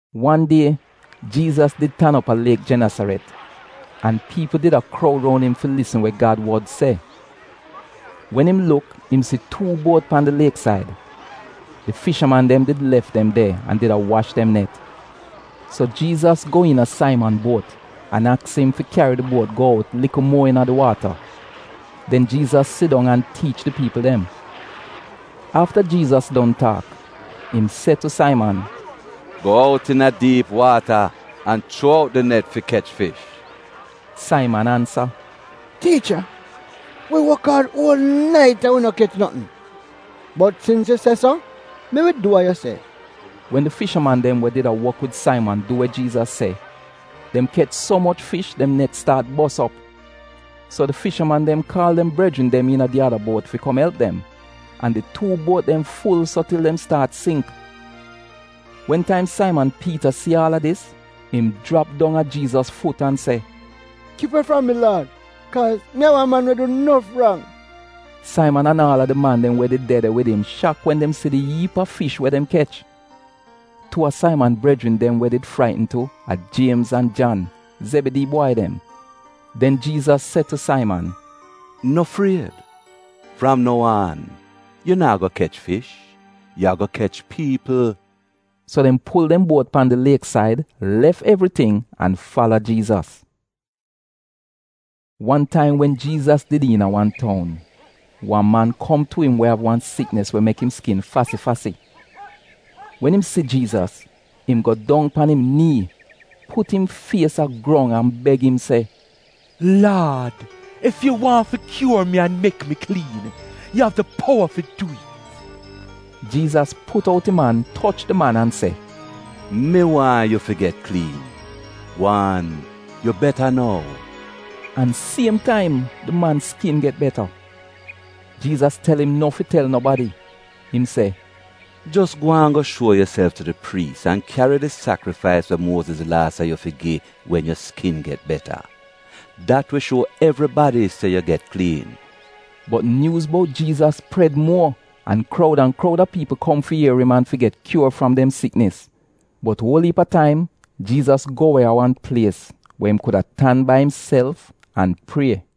Wan die, Jiizas did tan op a liek Genesaret an piipl did a kroud roun im fi lisn we Gad wod se. Wen im luk im si tuu buot pan di lieksaid. Di fishaman dem did lef dem de an did a wash dem net. So Jiizas go iina Saiman buot, an aks im fi kyari di buot go out likl muo iina di waata. Den Jiizas sidong an tiich di piipl dem. Afta Jiizas don taak, im se tu Saiman, “Go out iina diip waata, an chuo out di net fi kech fish.” Saiman ansa, “Tiicha, wi wok aad uol nait an wi no kech notn. Bot sins yu se so, mi wi du wa yu se.” Wen di fishaman dem we did a wok wid Saiman du we Jiizas se, dem kech so moch fish dem net staat bos op. So di fishaman dem kaal dem brejrin dem iina di ada buot fi kom elp dem, an di tuu buot dem ful so til dem staat singk. Wen taim Saiman Piita si aal a dis, im jrap dong a Jiizas fut an se, “Kip we fram mi Laad kaaz mi a wan man we du nof rang!” Saiman an aal a di man dem we did de de wid im shak wen dem si di iip a fish we dem kech. Tuu a Saiman brejrin dem we did fraitn tu, a Jiemz an Jan, Zebidii bwai dem. Den Jiizas se tu Saiman, “No fried, fram nou aan, yu naa go kech fish, yu ago kech piipl.” So dem pul dem buot pan di lieksaid, lef evriting an fala Jiizas. Wan taim wen Jiizas did iina wan toun, wan man kom tu im we av wan siknis we mek im skin fasi-fasi. Wen im si Jiizas, im go dong pan im nii, put im fies a grong an beg im se, “Laad, ef yu waahn fi kyuor mi an mek mi kliin, yu av di powa fi dwi'it.” Jiizas put out im an toch di man an se “Mi waahn yu fi get kliin. Gwaan yu beta nou!” An siem taim di man skin get beta. Jiizas tel im no fi tel nobadi, im se “Jos gwaan go shuo yuself tu di priis an kyari di sakrifais we Muoziz Laa se yu fi gi wen yu skin get beta. Dat wi shuo evribadi se yu get kliin.” Bot nyuuz bout Jiizas pred muo, an kroud an kroud a piipl kom fi ier im an fi get kyuor fram dem siknis. Bot uol iip a taim Jiizas go we a wan plies we im kuda tan bai imself an prie.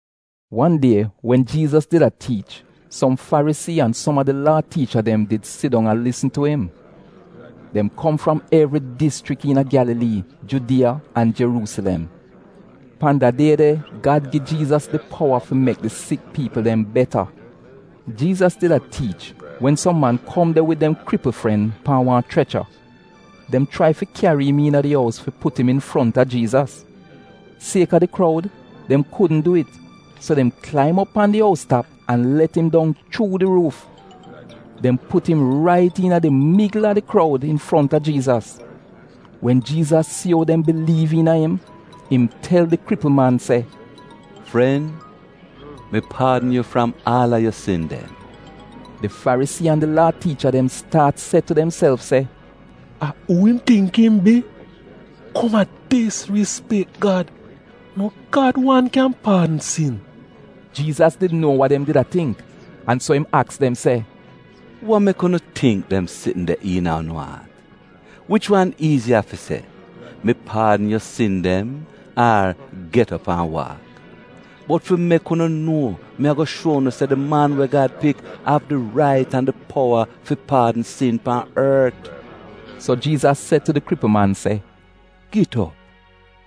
Wan die wen Jiizas did a tiich, som Farisii an som a di Laa tiicha dem did sidong a lisn tu im. Dem kom fram evri dischrik iina Gyalalii, Judiya an Jeruusilem. Pan da die de Gad gi Jiizas di powa fi mek di sik piipl dem beta. Jiizas did a tiich wen som man kom de wid dem kripl fren pan wan chrecha. Dem chrai fi kyari im iina di ous, fi put im infronta Jiizas. Sieka di kroud, dem kudn du it, so dem klaim op pan di ous tap an let im dong chuu di ruuf. Dem put im rait iina di migl a di kroud, infronta Jiizas. Wen Jiizas si ou dem biliiv iina im, im tel di kripl man se, “Fren, mi paadn yu fram aal a yu sin dem.” Di Farisii an di Laa tiicha dem staat se tu demself se, “A uu im tingk im bi, kom a disrispek Gad! No Gad wan kyan paadn sin?” Jiizas did nuo wa dem did a tingk an so im aks dem, “Wa mek unu tingk dem sitn de iina unu aat? Wich wan iiziya, fi se, ‘Mi paadn yu sin dem,’ ar, ‘Get op an waak?’ Bot fi mek unu nuo, mi ago shuo unu se di Man we Gad Pik av di rait an di powa fi paadn sin pan ort,” so Jiizas se tu di kripl man se, “Git op,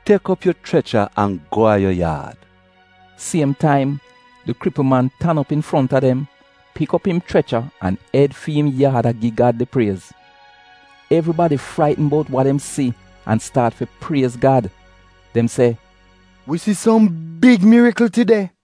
tek op yu chrecha an go a yu yaad.” Siem taim, di kripl man tan op infronta dem, pik op im chrecha, an ed fi im yaad a gi Gad di priez. Evribadi fraitn bout wa dem si an staat fi priez Gad. Dem se, “Wi si som big mirikl tide.”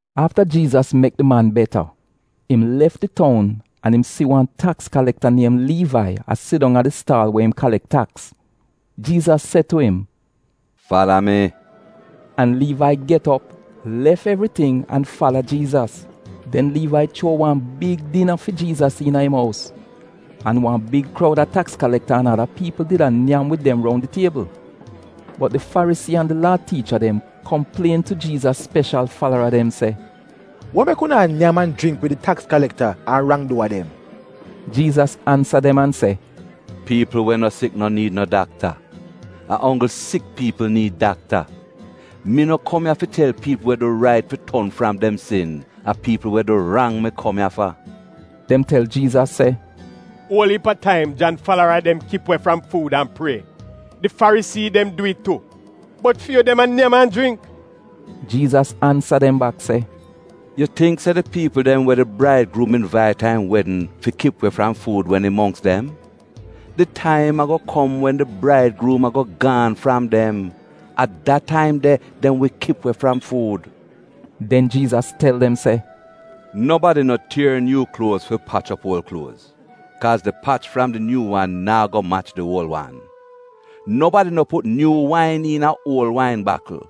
Afta Jiizas mek di man beta, im lef di toun an im si wan taks kalekta niem Liivai, a sidong a di staal we im kalek taks. Jiizas se tu im, “Fala mi.” An Liivai get op, lef evriting an fala Jiizas. Den Liivai chuo wan big dina fi Jiizas iina im ous, an wan big kroud a taks kalekta an ada piipl did a nyam wid dem roun di tiebl. Bot di Farisii an di Laa tiicha dem, komplien tu Jiizas speshal falara dem se, “Wa mek unu a nyam an jringk wid di taks kalekta an rang-duwa dem?” Jiizas ansa dem an se, “Piipl we no sik no niid no dakta, a onggl sik piipl niid dakta. Mi no kom ya fi tel piipl we du rait fi ton fram dem sin, a piipl we du rang mi kom ya fa.” Dem tel Jiizas se, “Uol iip a taim, Jan falara dem kip we fram fuud an prie. Di Farisii falara dem dwi'it tu. Bot fi yu dem a nyam an jringk.” Jiizas ansa dem bak se, “Yu tingk se di piipl dem we di braidgruum invait a im wedn fi kip we fram fuud wen im mongks dem? Di taim ago kom wen di braidgruum a go gaan fram dem. A da taim de, dem wi kip we fram fuud.” Den Jiizas tel dem se, “Nobadi no tier nyuu kluoz fi pach op uol kluoz, kaaz di pach fram di nyuu wan naa go mach di uol wan. Nobadi no put nyuu wain iina uol wain bakl.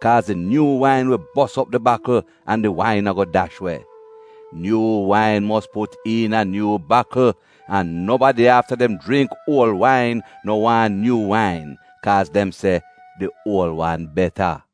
Kaaz di nyuu wain wi bos op di bakl, an di wain a go dash we. Nyuu wain mos put iina nyuu bakl. An nobadi, afta dem jringk uol wain, no waahn nyuu wain, kaaz dem se, ‘Di uol wan beta.’”